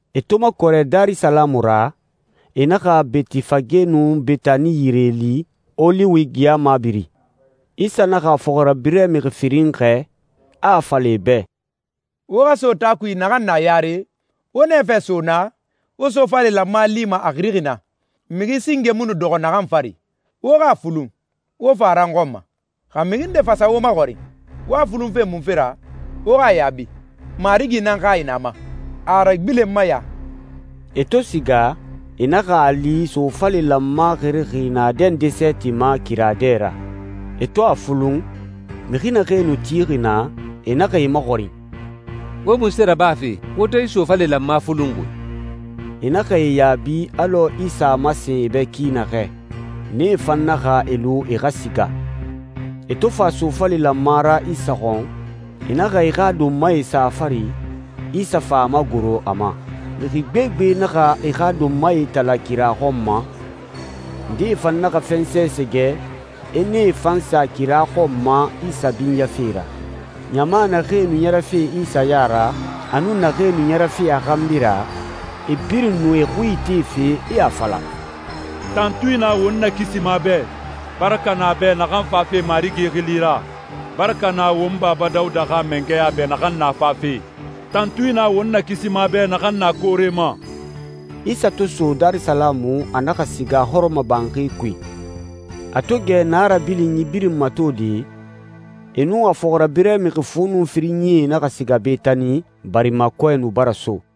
E to makɔrɛ Darisalamu ra, e na Betifage nun Betani yire li, Oliwi geya mabiri, Isa naxa a fɔxirabirɛ mixi firin xɛɛ, a a fala e bɛ, «Wo xa so taa kui naxan na yare. Wo nɛfɛ so naa, wo sofale lanma lima a xirixi na, mixi singe mu nu dɔxɔ naxan fari. Wo xa a fulun, wo fa a ra n xɔn ma. Xa mixi nde fa sa wo maxɔrin, ‹Wo a fulunfe munfe ra,› wo xa a yaabi, ‹Marigi nan hayi na a ma. A a ragbilenma ya.›» E to siga, e naxa a li sofale lanma xirixi naadɛ nde sɛɛti ma kira dɛ ra. E to a fulun, mixi naxee nu tixi naa, e naxa e maxɔrin, «Wo munse rabafe, wo to yi sofale lanma fulunxi?» E naxa e yaabi alɔ Isa a masen e bɛ ki naxɛ. Nee fan naxa e lu e xa siga. E to fa sofale lanma ra Isa xɔn, e naxa e xa donmae sa a fari, Isa fa a magoro a ma. Mixi gbegbe naxa e xa donmae itala kira xɔn ma, ndee fan naxa fɛnsɛ sɛgɛ, e nee fan sa kira xɔn ma Isa binyafe ra. Ɲama naxee nu ɲɛrɛfe Isa ya ra, a nun naxee nu ɲɛrɛfe a xanbi ra, e birin nu e xui itefe, e a fala, «Tantui na won Nakisima bɛ! Baraka na a bɛ naxan fafe Marigi xili ra! Baraka na won Baba Dawuda xa mangɛya bɛ naxan na fafe! Tantui na won Nakisima bɛ naxan na koore ma!» Isa to so Darisalamu, a naxa siga hɔrɔmɔbanxi kui. A to gɛ naa rabilinyi birin matode, e nun a fɔxirabirɛ mixi fu nun firinyie naxa siga Betani, barima kɔɛ nu bara so.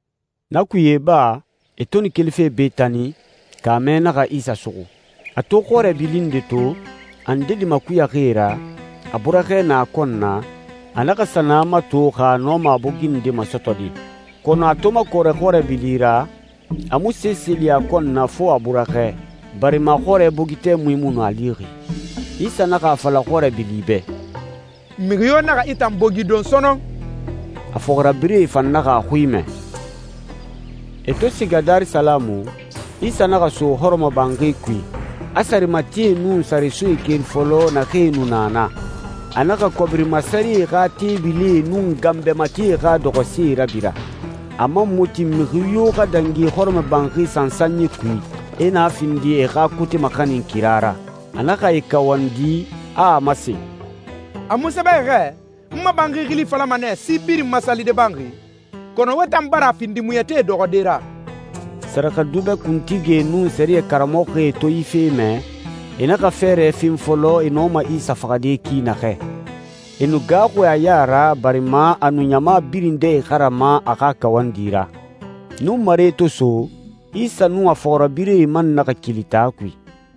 Na kuye iba, e to nu kelife Betani, kaamɛ naxa Isa suxu. A to xɔrɛ bili nde to, a ndedi makuyaxi e ra, a burɛxɛ na a kɔn na, a naxa sa na mato, xa a nɔma a bogi nde masɔtɔde. Kɔnɔ a to makɔrɛ xɔrɛ bili ra, a mu sese li a kɔn na fo a burɛxɛ, barima xɔrɛ bogi tɛmui mu nu a lixi. Isa naxa a fala xɔrɛ bili bɛ, «Mixi yo naxa i tan bogi don sɔnɔn!» A fɔxirabirɛe fan naxa a xui mɛ. E to siga Darisalamu, Isa naxa so hɔrɔmɔbanxi kui, a sarematie nun saresoe keri fɔlɔ, naxee nu na naa. A naxa kɔbiri masarɛe xa teebilie nun ganbɛ matie xa dɔxɔsee rabira. A man mu tin mixi yo xa dangi hɔrɔmɔbanxi sansanyi kui, e na findi e xa kote maxanin kira ra. A naxa e kawandi, a a masen, «A mu sɛbɛxi xɛ, ‹N ma banxi xili falama nɛ, si birin ma salide banxi›? Kɔnɔ wo tan bara a findi muɲɛtie dɔxɔde ra.» Sɛrɛxɛdubɛ kuntigie nun sɛriyɛ karamɔxɔe to yi fe mɛ, e naxa fɛɛrɛ fen fɔlɔ e nɔma Isa faxade ki naxɛ. E nu gaaxuxi a ya ra, barima a nu ɲama birin dɛ ixarama a xa kawandi ra. Nunmare to so, Isa nun a fɔxirabirɛe man naxa keli taa kui.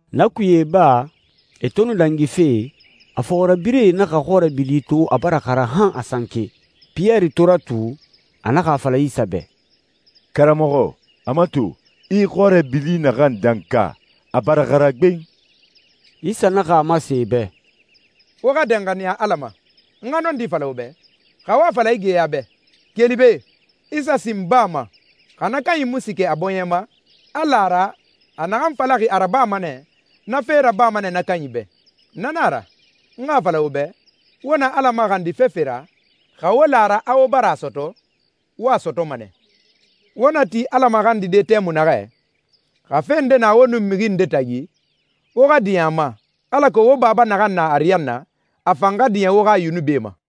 Na kuye iba, e to nu dangife, a fɔxirabirɛe naxa xɔrɛ bili to a bara xara han a sanke. Piyɛri to ratu, a naxa a fala Isa bɛ, «Karamɔxɔ, a mato, i xɔrɛ bili naxan danka, a bara xara gben.» Isa naxa a masen e bɛ, «Wo xa danxaniya Ala ma. N xa nɔndi fala wo bɛ, xa wo a fala yi geya bɛ, ‹Keli be, i sa sin baa ma,› xa na kanyi mu siikɛ a bɔɲɛ ma, a la a ra, a naxan falaxi a rabama nɛ, na fe rabama nɛ na kanyi bɛ. Na nan a ra, n xa a fala wo bɛ, wo na Ala maxandi fefe ra, xa wo la a ra a wo bara a sɔtɔ, wo a sɔtɔma nɛ. Wo na ti Ala maxandide tɛmui naxɛ, xa fe nde na wo nun mixi nde tagi, wo xa diɲɛ a ma, alako wo Baba naxan na ariyanna, a fan xa diɲɛ wo xa yunubie ma.»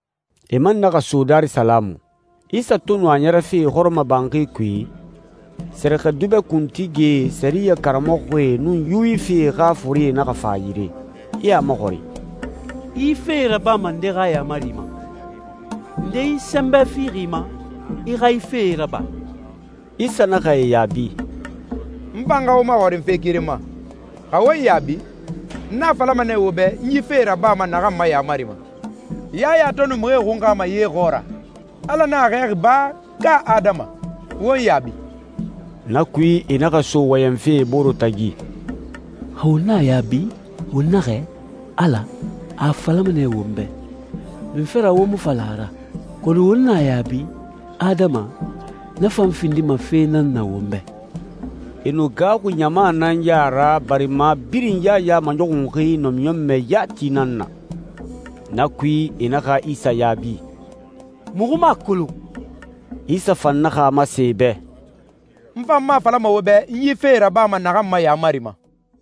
E man naxa so Darisalamu. Isa to nu a ɲɛrɛfe hɔrɔmɔbanxi kui, sɛrɛxɛdubɛ kuntigie, sɛriyɛ karamɔxɔe, nun Yuwifie xa forie naxa fa a yire, e a maxɔrin, «I yi fee rabama nde xa yaamari ma? Nde yi sɛnbɛ fixi i ma, i xa yi fee raba?» Isa naxa e yaabi, «N fan xa wo maxɔrin fe keren ma. Xa wo n yaabi, n a falama nɛ wo bɛ n yi fee rabama naxan ma yaamari ma. Yaya to nu mixie xunxama ye xɔɔra, Ala nan a xɛɛxi ba, ka adama? Wo n yaabi.» Na kui e naxa so wɔyɛnfe e bore tagi, «Xa won na a yaabi, won naxɛ, ‹Ala,› a a falama nɛ won bɛ, ‹Munfe ra wo mu fa la a ra?› Kɔnɔ won na a yaabi, ‹Adama,› na fan findima fe nan na won bɛ.» E nu gaaxuxi ɲama nan ya ra, barima birin Yaya maɲɔxunxi namiɲɔnmɛ yati nan na. Na kui, e naxa Isa yaabi, «Muxu mu a kolon.» Isa fan naxa a masen e bɛ, «N fan mu a falama wo bɛ n yi fee rabama naxan ma yaamari ma.»